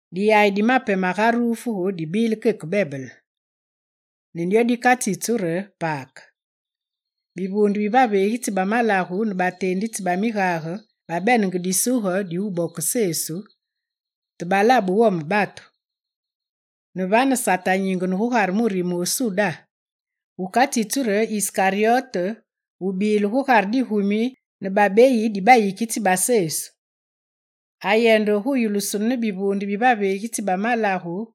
Diyayi di mape magarufuge dibile keke bebele. Ne dyo dikatsitsu re Pake. Bivuunde bi baveegitsi ba malagu ne bateenditsi ba migage babenenge disuge di wubokise Sesu, te balabe wome batu. Ne vane Sate anyingene gugare murime wu Suda wukatsitsu re Iskaryote, wubile gugare digumi ne babeyi di bayikitsi ba Sesu. Ayende gu yulusunu ne bivuunde bi baveegitsi ba malagu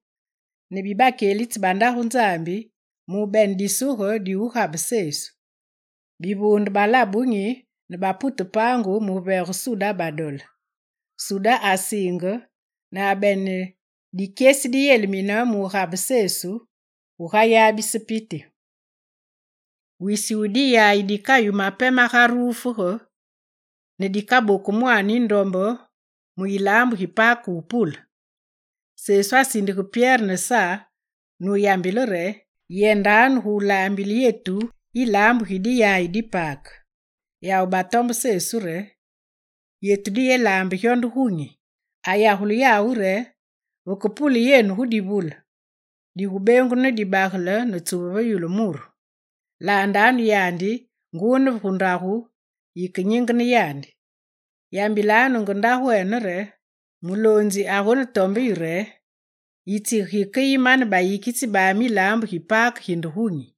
ne bi bakyelitsi ba Ndagu Nzambi, mu wubene disuge di wugabe Sesu. Bivuunde balabe wunyi ne bapute paangu mu wuveege Suda badole. Suda asiinge ne abene dikyesi diyelimine mugabe Sesu gugayabise piti. Wisi wu diyayi dikayu mape magarufuge ne dikaboku mwaane yindombe mu yilaambu gi Pake wupule. Sesu asindige Pyere ne Sa nuyambile re: «Yendanu gu laambile yetu yilaambu gi diyaye di Pake.» Yawu batombe Sesu re: «Yetu diyelaambe gyo nde gunyi?» Ayagule yawu re: «Vekepule yenu gu divule, digubengunu ne dibagele ne tsuve maambe gu yulu muru. Laandanu yandi nguu ne gu ndagu yikenyingene yandi. Yambilanu nge ndagwene re: “Muloonzi agonetombe yu re: Itsige gikeyi mane bayikitsi bami yilaambu gi Pake ginde gunyi?”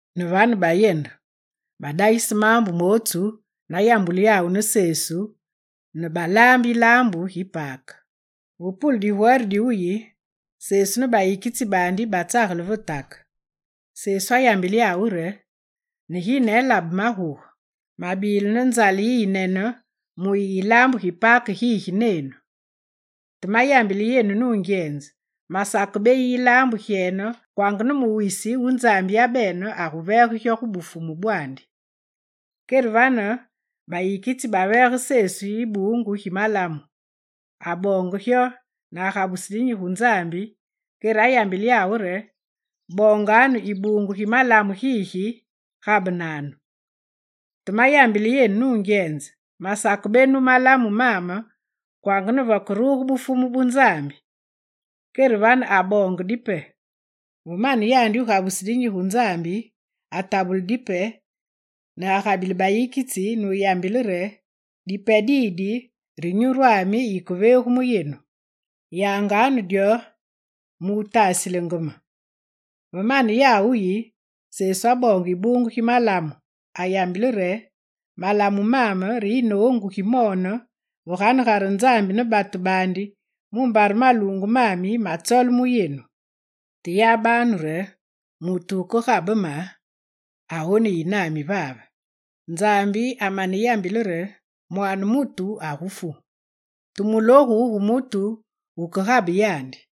Ne vane bayende. Badagise maambu mootsu nayambulu yawu ne Sesu ne balaambe yilaambu gi Pake. Ve pule digwere diwuyi, Sesu ne bayikitsi baandi batsagele ve take. Sesu ayambile yawu re: «Neginene labe maguge, mabile ne nzale yiyinene muyi yilaambu gi Pake gigi nenu. Te mayambile yenu nungyenze, masakebeyi yilaambu gyene kwanga ne mu wisi wu Nzambi yabene aguveege gyo gu Bufumu bwaandi.» Kere vane bayikitsi baveege Sesu ibuungu gi malamu. Aboonge gyo ne agabuse dinyi gu Nzambi, kere ayambile yawu re: «Boonganu ibuungu gi malamu gigi gabenanu. Te mayambile yenu nungyenze, masakebenu malamu maame kwanga ne vekeruge Bufumu bu Nzambi.» Kere vane aboonge dipe. Ve mane yandi wugabuse dinyi gu Nzambi, atabule dipe ne agabile bayikitsi nuyambile re: «Dipe didi re nyurwani yikeveegu mu yenu. Yangenganu dyo mu wutasilenge me.» Ve mane yawu wuyi, Sesu aboonge ibuungu gi malamu, ayambile re: «Malamu maame re yinoongu gimoone ve ganegare Nzambi ne batu baandi mumbare maluungu mami magutsole mu yenu. Te yabanu re, mutu wukegabe me agoneyi nami vave. Nzambi amaneyambile re: Mwaane mutu agufu. Te mulogu gu mutu wukegabe yandi!»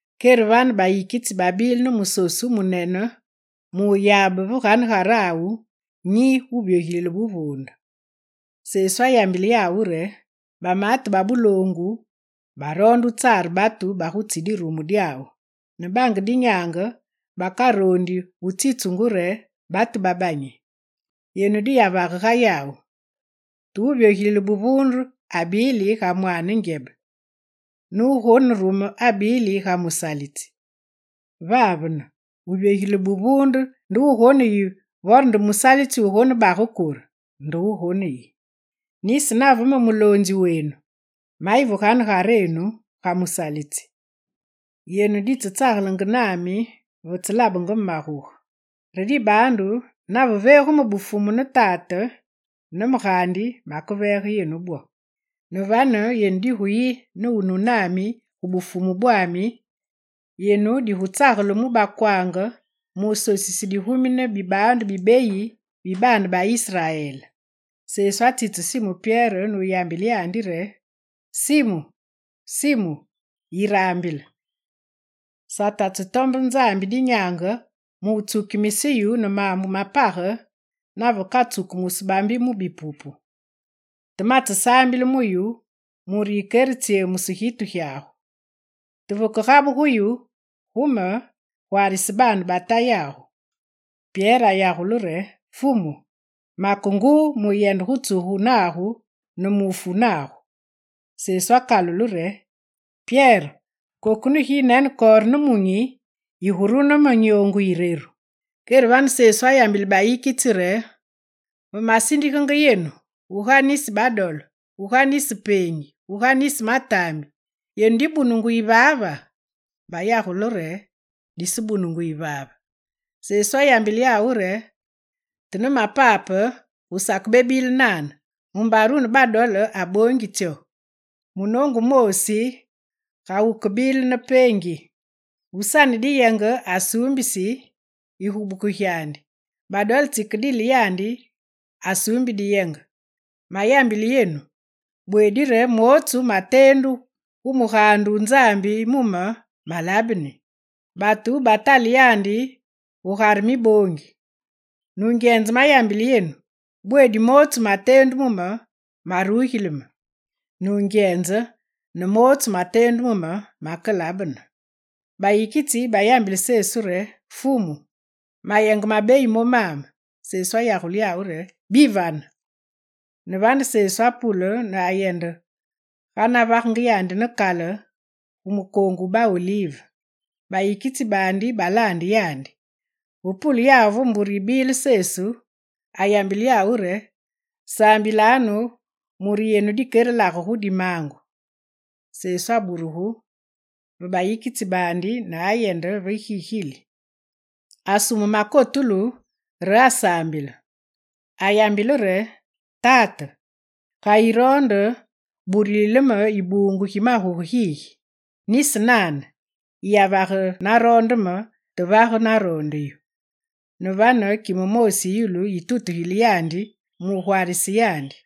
Kere vane bayikitsi babile ne musosu wumunene mu wuyabe ve ganegarawu nyi wuvyogilile buvuunde. Sesu ayambile yawu re: «Bamaate ba buloongu baroonde wutsare batu bagutsi dirumu dyawu, ne bange dinyaange bakaroondi wutsitsungu re batu babanyi. Yenu diyavage ga yawu. Te wuvyogilile buvuunde abili ga mwaane ngyebe, ne wugonerume abili ga musalitsi. Vavene, wuvyogilile buvuunde nde wugoneyi vore nde musalitsi wugonebage kure? Nde wugoneyi. Nisi nave me muloonzi wenu, mayi ve ganegarenu ga musalitsi. Yenu ditsetsagelenge nami vetselabenge me maguge. Re dibaandu nave veegu me Bufumu ne Tate ne me gaandi maveege yenu bwo. Ne vane yenu diguyi ne wunu nami gu Bufumu bwami, yenu digutsagele mu bakwaange mu wusosise digumi ne bibaandu bibeyi bi baane ba Israel.» Sesu atsitse Simu Pyere nuyambile yandi re: «Simu, Simu, yiraambile! Sate atsetombe Nzambi dinyaange mu wutsukimise yu ne maambu ma page, navekatsukumusu bambi mu bipupu. Te matsesaambile mu yu mure yikeretsyemuse gitu gyagu. Te vekegabuge yu gu me, gwaarise baane ba Tayagu.» Pyere ayagule re: «Fumu, make nguu muyende gu tsugu nagu ne mu wufu nagu.» Sesu akalule re: «Pyere, koku ne ginekore nemunyi, yigurune me nyoongu yireru.» Kere vane Sesu ayambile bayikitsi re: «Ve masindigenge yenu guga nisi badole, guga nisi peengi, guga nisi mataambi, yenu dibunungu yivaava?» Bayagule re: «Disebunungu yivaave.» Sesu ayambile yawu re: «Te ne mapape gu sakebebile nane mumbare wune badole aboongi tsyo, munoongu wumoosi ga wukebile ne peengi. Wusane dinyenge asuumbisi yigubuku gyandi, badole tsikedile yandi asuumbi diyenge. Mayambile yenu, bweedi re mootsu mateendu gu mugaande wu Nzambi mu me, malabeni: “Batu batale yandi gu Gugare miboongi.” Nungyenze mayambile yenu, bweedi mootsu mateendu mu me, marugili me. Nungyenze ne mootsu mateendu mu me makelabene.» Bayikitsi bayambile Sesu re: «Fumu, mayenge mabeyi momame.» Sesu ayagule yawu re: «Bivane.» Ne vane, Sesu apule ne ayende ga navaga yandi ne kale gu mukoongu wu ba Olive. Bayikitsi baandi balaande yandi. Ve pule yawu ve mbure yibile Sesu, ayambile yawu re: «Saambilanu mure yenu dikerelage gu dimaangu.» Sesu aburugu ve bayikitsi baandi ne ayende ve gigili. Asume makotulu re asaambile. Ayambile re: «Tate, ga yiroonde burulile me ibuungu gi maguge gigi! Nisi nane, yiyavage naroonde me, te vage naroonde yu.» [ Ne vane kime moosi yi yulu yitutugile yandi mu wugwaarise yandi.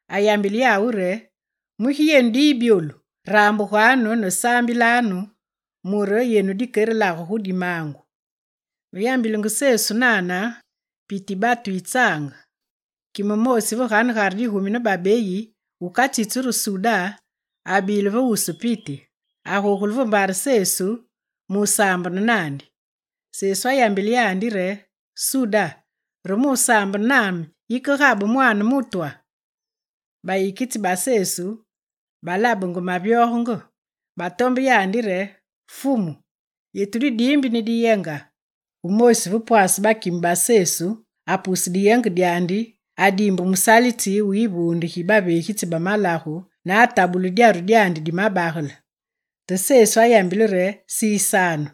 Ayambile yawu re: «Mugi yenu diyi byolu? Rambuganu, saambilanu mure yenu dikerelage gu dimaangu.» Ve yambilenge Sesu nane, piti yi batu yitsange. Kime moosi ve ganegare digumi ne babeyi, wukatsitsu re Suda, abile ve wusu piti. Agogule ve mbare Sesu mu wusaambene naandi. Sesu ayambile yandi re: «Suda, re mu wusaambene, yikegabe Mwaane mutwa!» Bayikitsi ba Sesu balabenge mavyogenge. Batombe yandi re: «Fumu, yetu didiimbi ne diyenga?» Wumoosi ve pwase bakime ba Sesu apuse diyenge dyandi adiimbe musalitsi wu yivuunde gi baveegitsi ba malagu ne atabule dyaru dyandi di mabagele. Te Sesu ayambile re: «Sisanu!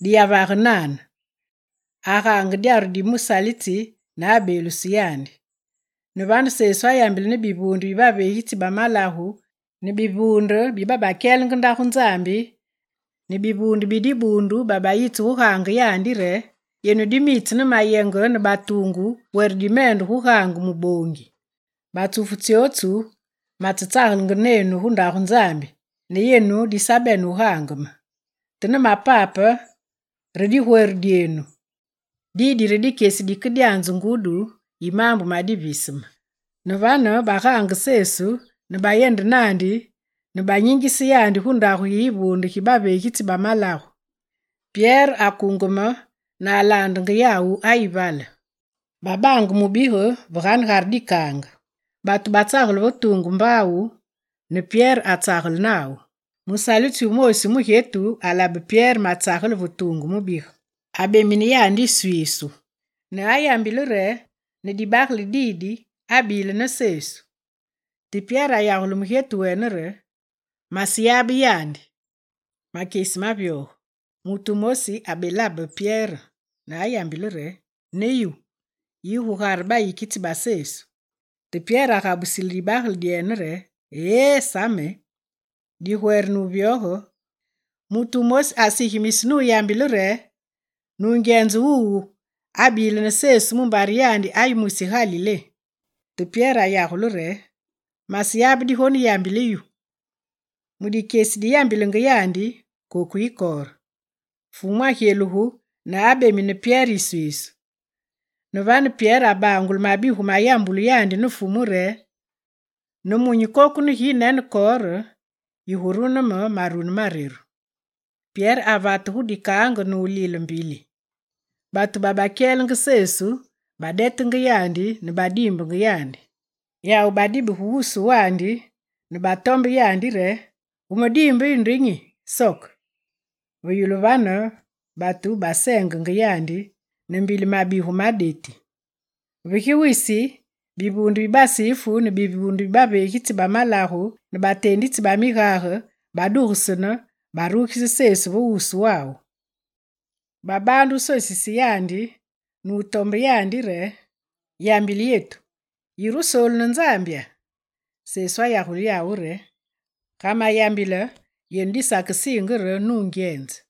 Diyavage nane.» Agaange dyaru di musalitsi ne abeeluse yandi. Ne vane Sesu ayambile ne bivuunde bi baveegitsi ba malagu, ne bivuunde babakyelenge ndagu disaambulu, ne bivuunde bi dibuundu babayitse gaange yandi re: «Yenu dimitse ne mayenge ne batuungu were dimende gu wugaange muboongi! Batsufu tsyotsu matsetsagelenge nenu gu Ndagu Nzambi ne yenu disabene wugaange me. Te ne mapape re digwere dyenu. Didi re dikyesi dikedyanze ngudi yi maambu ma diviseme.» Ne vane, bagaange Sesu ne bayende naandi ne banyingise yandi gu ndagu yi yivuunde gi baveegitsi ba malagu. Pyere akungeme ne alaandenge yawu ayi gu vale. Babaange mubige ve ganegare dikaange. Batu batsagele ve tuungu mbaawu ne Pyere atsagele nawu. Musalitsi wumoosi wu mugyetu wulabe Pyere matsagele ve tuungu mubige. Abemine yandi yiswiisu ne ayambile re: «Ne dibagale didi abile ne Sesu!» Te Pyere ayagule mugyetu wene re: «Maseyabe yandi!» Ma makyesi mavyoge, mutu wumosi abelabe Pyere ne ayambile re: «Ne yu, yi gugare bayikitsi ba Sesu!» Te Pyere agabusile dibagele dyene re: «Ee, sa me!» Digwere ne wuvyoge, mutu wumosi asigimise nuyambile re: «Nungyenze wuwu abile ne Sesu mumbare yandi ayi mwisi Galilé.» Te Pyere ayagule re: «Maseyabe digoneroonde yambile yu.» Mu dikyesi diyambilenge yandi, koku yikore. Fumu agyelugu ne wubemine Pyere yiswiisu. Ne vane Pyere abangule mabigu mayambulu yandi ne Fumu re: «Ne munyi koku neginekore, yigurune me marune mareru.» Pyere avate gu dikaange ne wulile mbili. Batu babakyelenge Sesu badetenge yandi ne badiimbenge yandi. Yawu badibige wusu wandi ne batombenge yandi re: «Wumediimbe yu nde nyi? Soke!» Ve yulu vane batu baseengenge yandi ne mbili mabigu ma deti. Ve gi wisi, bivuunde bi Basifu ne bivuunde bi baveegitsi ba malagu ne bateenditsi ba migage, badugesene, barugise Sesu ve wuswawu. Babaande wusosise yandi ne wutombe yandi re: «Yambile yetu, yire Wusoolu ne Nzambya?» Sesu ayagule yawu re: «Ga mayambile yenu disakesiinge re nungyenze.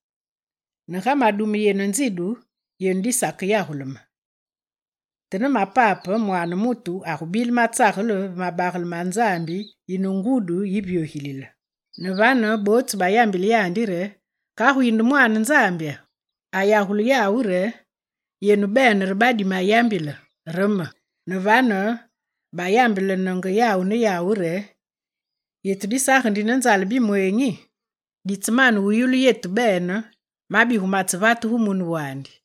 Maredume yenu nzidu, yenu disakeyagule me. Te ne mapape, Mwaane mutu agubile matsagele ve mabagele ma Nzambi yine ngudi yivyogilile.» Ne vane bootsu bayambile yandi re: «Kagu yinde Mwaane Nzambya?» Ayagule yawu re: «Yenu bene re badimayambile: re me.» Ne vane bayambelenenge yawu ne yawu re: «Yetu disagendi ne nzale bimweenyi! Ditsemane yulu yetu bene mabigu matsevate gu mune wandi!»